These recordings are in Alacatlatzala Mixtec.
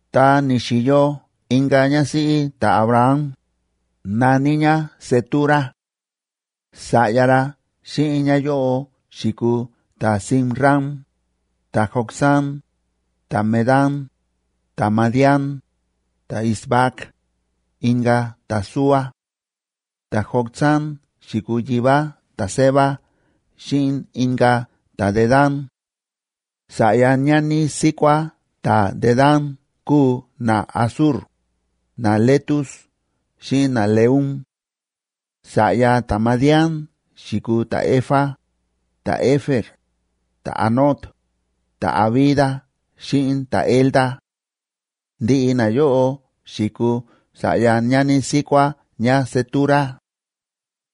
Ta ni̱xi̱yo inka̱ ñásíꞌí ta̱Abraham, na̱ní ñá Cetura. Sa̱ꞌya ra xíꞌin ñáyóꞌo xi̱kuu ta̱Zimram, ta̱Jocsán, ta̱Medán, ta̱Madián, ta̱Isbac, inka̱ ta̱Súa. Ta̱Jocsán xi̱kuu yivá ta̱Seba xíꞌin inka̱ ta̱Dedán. Sa̱ꞌya ñani síkuá ta̱Dedán kúu naAsur, naLetus xíꞌin naLeum. Sa̱ꞌya ta̱Madián xi̱kuu ta̱Efa, ta̱Efer, ta̱Hanoc, ta̱Abida xíꞌin ta̱Elda. Ndiꞌi nayóꞌo xi̱kuu sa̱ꞌya ñani síkuá ñáCetura.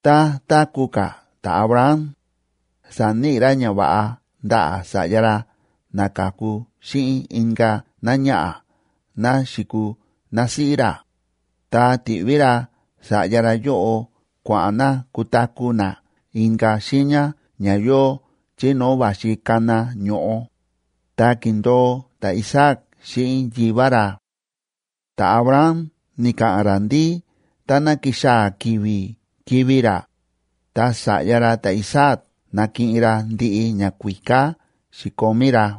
Tá táku̱ ka̱ ta̱Abraham, sa̱níꞌi ra ñava̱ꞌa ndaꞌa̱ sa̱ꞌya ra na ka̱ku xíꞌin inka̱ náñaꞌa̱ ná xi̱kuu násíꞌí ra, ta ti̱ꞌví ra sa̱ꞌya ra yóꞌo kua̱ꞌa̱n na kutaku̱ na inka̱ xiiña ña yóo chí no̱o̱ va̱xi kana ño̱ꞌo, ta ki̱ndo̱o ta̱Isaac xíꞌin yivá ra. Ta̱Abraham ni̱ka̱ꞌa̱n ra ndí táná kixaa̱ ki̱vi̱ kivi̱ ra, ta sa̱ꞌya ra ta̱Isaac nakiꞌin ra ndiꞌi ñakuíká xi̱komí ra.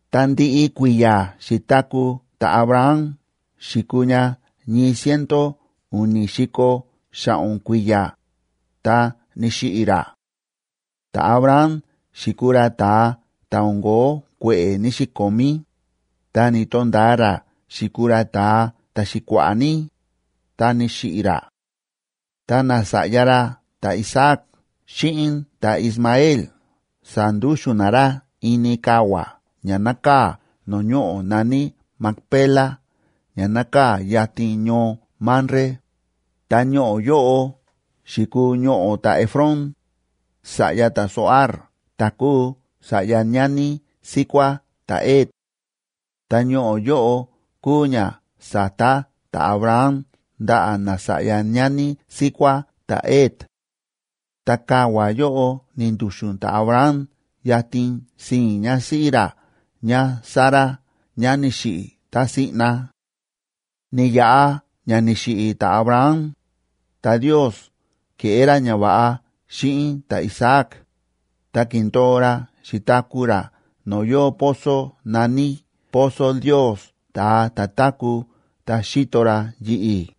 Ta ndiꞌi kui̱ya̱ xi̱taku̱ ta̱Abraham xi̱kuu ña ñii ciento u̱ni̱ si̱ko̱ xa̱ꞌo̱n kui̱ya̱, ta ni̱xiꞌi̱ ra. Ta̱Abraham xi̱kuu ra ta̱a ta̱ o̱n ko̱ó kue̱ꞌe̱ ní‑xikomí, ta ni̱to̱nda̱a ra xi̱kuu ra ta̱a ta̱xi̱kua̱ꞌa̱ ní, ta ni̱xiꞌi̱ ra. Ta nasa̱ꞌya ra ta̱Isaac xíꞌin ta̱Ismael sa̱ndúxu̱n na ra ini kavua̱ ña nákaa̱ no̱o̱ ñoꞌo̱ na̱ní Macpela ña nákaa̱ yatin ñoo Mamre, ta ñoꞌo̱ yóꞌo xi̱kuu ñoꞌo̱ ta̱Efrón, sa̱ꞌya ta̱Zohar ta̱ kúu sa̱ꞌya ñani síkuá ta̱Het. Ta ñoꞌo̱ yóꞌo kúu ña sa̱ta ta̱Abraham ndaꞌa̱ nasa̱ꞌya ñani síkuá ta̱Het. Ta kavua̱ yóꞌo ni̱ndu̱xu̱n ta̱Abraham yatin sii̱n ñásíꞌí ra ñáSara ñá ni̱xiꞌi̱ tá siꞌna. Ni̱yaꞌa ña ni̱xiꞌi̱ ta̱Abraham, ta Ndios ke̱ꞌé ra ñava̱ꞌa xíꞌin ta̱Isaac, ta ki̱ndo̱o ra xi̱taku̱ ra no̱o̱ yóo pozo na̱ní Pozo Ndios, ta̱a ta̱ táku̱ ta xíto ra yi̱ꞌi̱.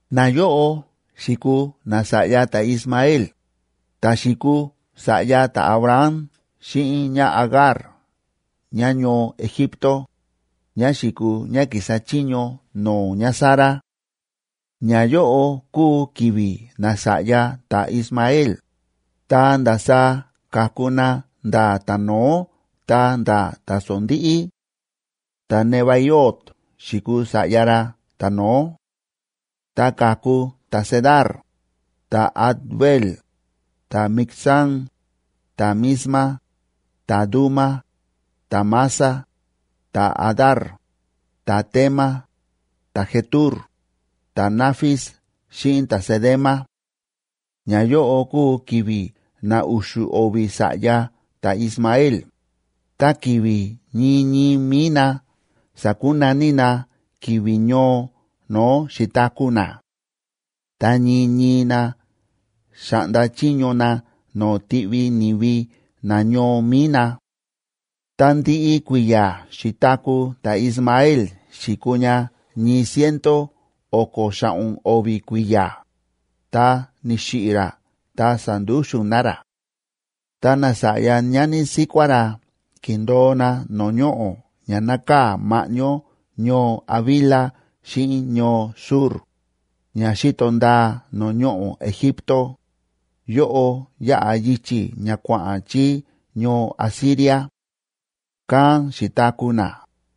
Nayóꞌo xi̱kuu nasa̱ꞌya ta̱Ismael, ta̱ xi̱kuu sa̱ꞌya ta̱Abraham xíꞌin ñáAgar ñáñoo Egipto, ñá xi̱kuu ñá ki̱sa chiño no̱o̱ ñáSara. Ñayóꞌo kúu ki̱vi̱ nasa̱ꞌya ta̱Ismael, ta ndasaá ka̱ku na nda̱ ta̱no̱ó ta̱nda̱ ta̱sondíꞌí: ta̱Nebaiot xi̱kuu sa̱ꞌya ra ta̱no̱ó; ta ka̱ku ta̱Cedar, ta̱Adbeel, ta̱Mibsam, ta̱Misma, ta̱Duma, ta̱Massa, ta̱Hadar, ta̱Tema, ta̱Jetur, ta̱Nafis xíꞌin ta̱Cedema. Ñayóꞌo kúu ki̱vi̱ na u̱xu̱ o̱vi̱ sa̱ꞌya ta̱Ismael, ta ki̱vi̱ ñii ñii mi̱i na sa̱kunaní na ki̱vi̱ ñoo no̱o̱ xi̱taku̱ na. Ta ñii ñii na xa̱ꞌnda chiño na no̱o̱ tiꞌvi ni̱vi nañoo mi̱i na. Ta ndiꞌi kui̱ya̱ xi̱taku̱ ta̱Ismael xi̱kuu ña ñii ciento o̱ko̱ xa̱ꞌo̱n o̱vi̱ kui̱ya̱, ta ni̱xiꞌi̱ ra ta sa̱ndúxu̱n na ra. Ta nasa̱ꞌya ñani síkuá ra ki̱ndo̱o na no̱o̱ ñoꞌo̱ ña nákaa̱ ma̱ꞌñó ñoo Havila xíꞌin ñoo Shur, ña xíto ndaa no̱o̱ ñoꞌo̱ Egipto, yóꞌo yáꞌa yichi̱ ña kua̱ꞌa̱n chí ñoo Asiria. Kán xi̱taku̱ na,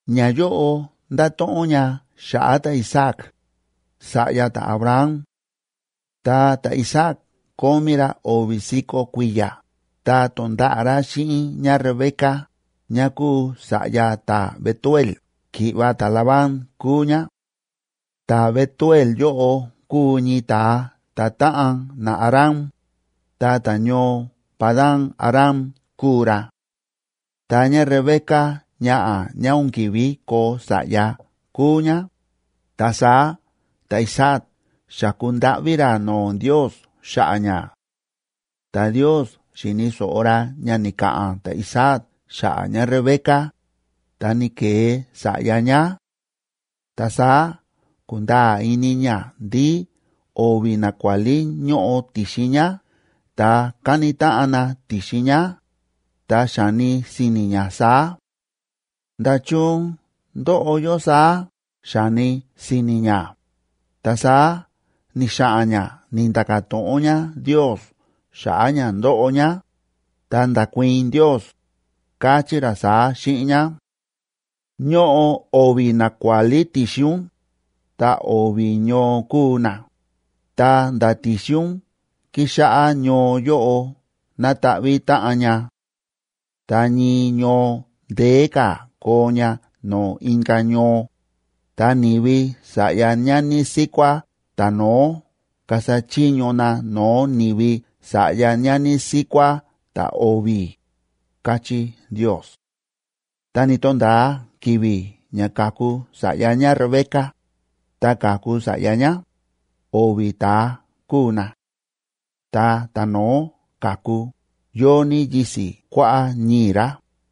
Ñayóꞌo ndáto̱ꞌon ña xa̱ꞌa̱ ta̱Isaac, sa̱ꞌya ta̱Abraham. Ta ta̱Isaac kómí ra o̱vi̱ si̱ko̱ kui̱ya̱, ta to̱nda̱ꞌa̱ ra xíꞌin ñáRebeca, ñá kúu sa̱ꞌya ta̱Betuel, ki̱ꞌva̱ ta̱Labán kúu ñá. Ta̱Betuel yóꞌo kúu ñii ta̱a ta̱táꞌan naAram, ta ta̱ñoo Padan‑aram kúu ra. Ta ñáRebeca ñaꞌa̱ ñá o̱n ki̱ví koo sa̱ꞌya kúu ñá, ta saá ta̱Isaac xa̱ku ndáꞌví ra no̱o̱ Ndiosb xa̱ꞌa̱ ñá. Ta Ndios xi̱ni̱ so̱ꞌo ra ña ni̱ka̱ꞌa̱n ta̱Isaac xa̱ꞌa̱ ñáRebeca, ta ni̱ke̱e sa̱ꞌya ñá. Ta saá ku̱nda̱a̱ ini ñá ndí o̱vi̱ nakuálí ñóꞌo ti̱xin ñá ta káni táꞌan na ti̱xin ñá, ta xa̱ni si̱ni̱ ñá saá: “¿Nda̱chun ndóꞌo yó saá?”, xa̱ni si̱ni̱ ñá. Ta saá ni̱xa̱ꞌa̱n ñá ni̱nda̱ka̱ to̱ꞌon ñá Ndios xa̱ꞌa̱ ña ndóꞌo ñá, ta nda̱kuii̱n Ndios, káchí ra saá xíꞌin ñá: Ñóꞌo o̱vi̱ nakuálí ti̱xin ún, ta o̱vi̱ ñoo kuu na, ta nda̱ ti̱xin ún kixáꞌá ñoo yóꞌo nata̱ꞌvi̱ táꞌan ña. Ta ñii ñoo ndeé ka̱ koo ña no̱o̱ inka̱ ñoo, ta ni̱vi sa̱ꞌya ñani síkuá ta̱no̱ó kasa chiño na no̱o̱ ni̱vi sa̱ꞌya ñani síkuá ta̱o̱vi̱, káchí Ndios. Ta ni̱to̱nda̱a ki̱vi̱ ña kaku sa̱ꞌya ñáRebeca, ta ka̱ku sa̱ꞌya ñá, o̱vi̱ ta̱a kúu na. Ta ta̱no̱ó ka̱ku, yóo ní yisi̱ kuáꞌá ñii̱ ra,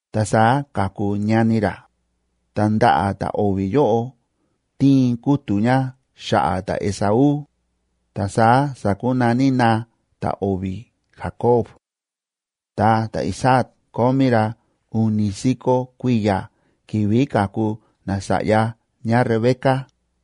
Ta saá ka̱ku ñani ra, ta ndaꞌa̱ ta̱o̱vi̱ yóꞌo ti̱in kútu̱ ña xa̱ꞌa̱ ta̱Esaú, ta saá sa̱kunaní na ta̱o̱vi̱ Jacob.d Ta ta̱Isaac kómí ra u̱ni̱ si̱ko̱ kui̱ya̱ ki̱vi̱ ka̱ku nasa̱ꞌya ñáRebeca.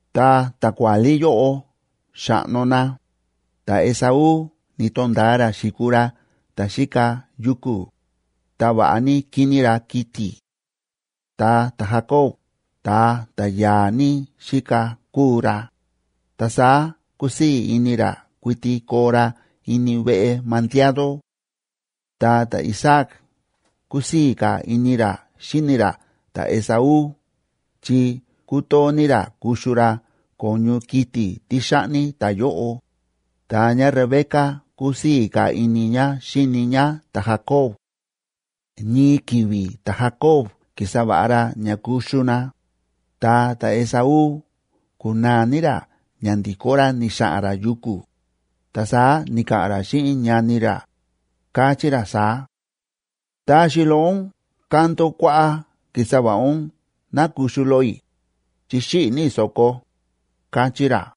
Ta ta̱kuálí yóꞌo xa̱ꞌno na, ta̱Esaú ni̱to̱nda̱a ra xi̱kuu ra ta̱ xíka yuku̱, ta va̱ꞌa ní kíní ra kiti̱; ta ta̱Jacob ta̱a ta̱ ya̱a̱ ní xíka kúu ra, ta saá kúsii̱ ini ra kuiti koo ra ini veꞌe mandiado. Ta ta̱Isaac kúsii̱ ka̱ ini ra xíni ra ta̱Esaú chi kútoo ní ra kuxu ra ko̱ñu kiti̱ tí xa̱ꞌni ta̱yóꞌo, ta ñáRebeca kúsii̱ ka̱ ini ñá xíni ñá ta̱Jacob. Ñii ki̱vi̱ ta̱Jacob ki̱sa va̱ꞌa ra ña kuxu na, ta ta̱Esaú ku̱naa ní ra ña ndi̱kó ra ni̱xa̱ꞌa̱n ra yuku̱, ta saá ni̱ka̱ꞌa̱n ra xíꞌin ñani ra, káchí ra saá: ―Taxi loꞌo ún kando kuáꞌá ki̱sa va̱ꞌa ún ná kuxu loꞌo i̱, chi xíꞌi̱ ní i̱ so̱ko ―káchí ra.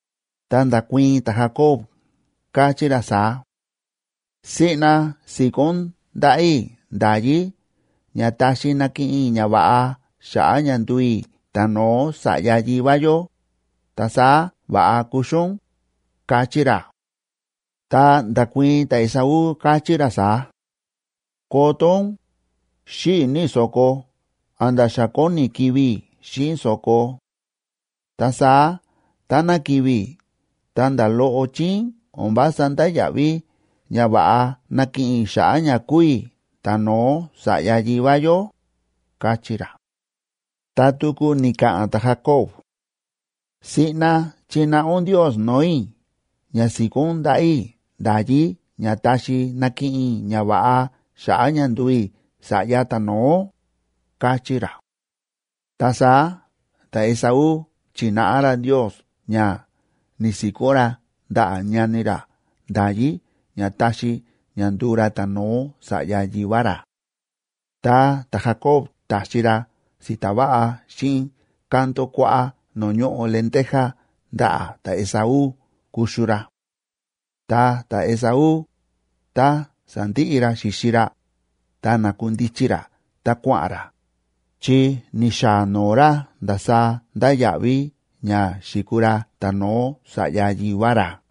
Ta nda̱kuii̱n ta̱Jacob, káchí ra saá: ―Siꞌna si̱kó ún ndaꞌa̱ i̱ nda̱yí ña taxi nakiꞌin i̱ ñava̱ꞌa xa̱ꞌa̱ ña nduu i̱ ta̱no̱ó sa̱ꞌya yivá yó, ta saá va̱ꞌa kuxu ún ―káchí ra. Ta nda̱kuii̱n ta̱Esaú, káchí ra saá: ―Koto ún, xíꞌi̱ ní i̱ so̱ko a̱nda̱ xa kóni kivi̱ i̱ xíꞌin so̱ko. Ta saá táná kivi̱ i̱ ta̱nda̱ loꞌo chíín o̱n vása ndáya̱ꞌví ñava̱ꞌa nakiꞌin i̱ xa̱ꞌa̱ ña kúu i̱ ta̱no̱ó sa̱ꞌya yivá yó ―káchí ra. Ta tuku ni̱ka̱ꞌa̱n ta̱Jacob: ―Siꞌna chináꞌa ún Ndios no̱o̱ i̱ ña si̱kó ún ndaꞌa̱ i̱ nda̱yí ña taxi nakiꞌin i̱ ñava̱ꞌa xa̱ꞌa̱ ña nduu i̱ sa̱ꞌya ta̱no̱ó ―káchí ra. Ta saá ta̱Esaú chi̱náꞌa ra Ndios ña ni̱si̱kó ra ndaꞌa̱ ñani ra nda̱yí ña taxi ña nduu ra ta̱no̱ó sa̱ꞌya yivá ra. Ta ta̱Jacob ta̱xi ra si̱ta̱ va̱ꞌa xíꞌin kando kuáꞌá no̱o̱ ñóꞌo lenteja ndaꞌa̱ ta̱Esaú kuxu ra. Ta ta̱Esaú, tá sa̱ndiꞌi ra xi̱xi ra, ta na̱kundichi ra ta kua̱ꞌa̱n ra, chi ni̱xaa noo ra ndasaá ndáya̱ꞌví ña xi̱kuu ra ta̱no̱ó sa̱ꞌya yivá ra.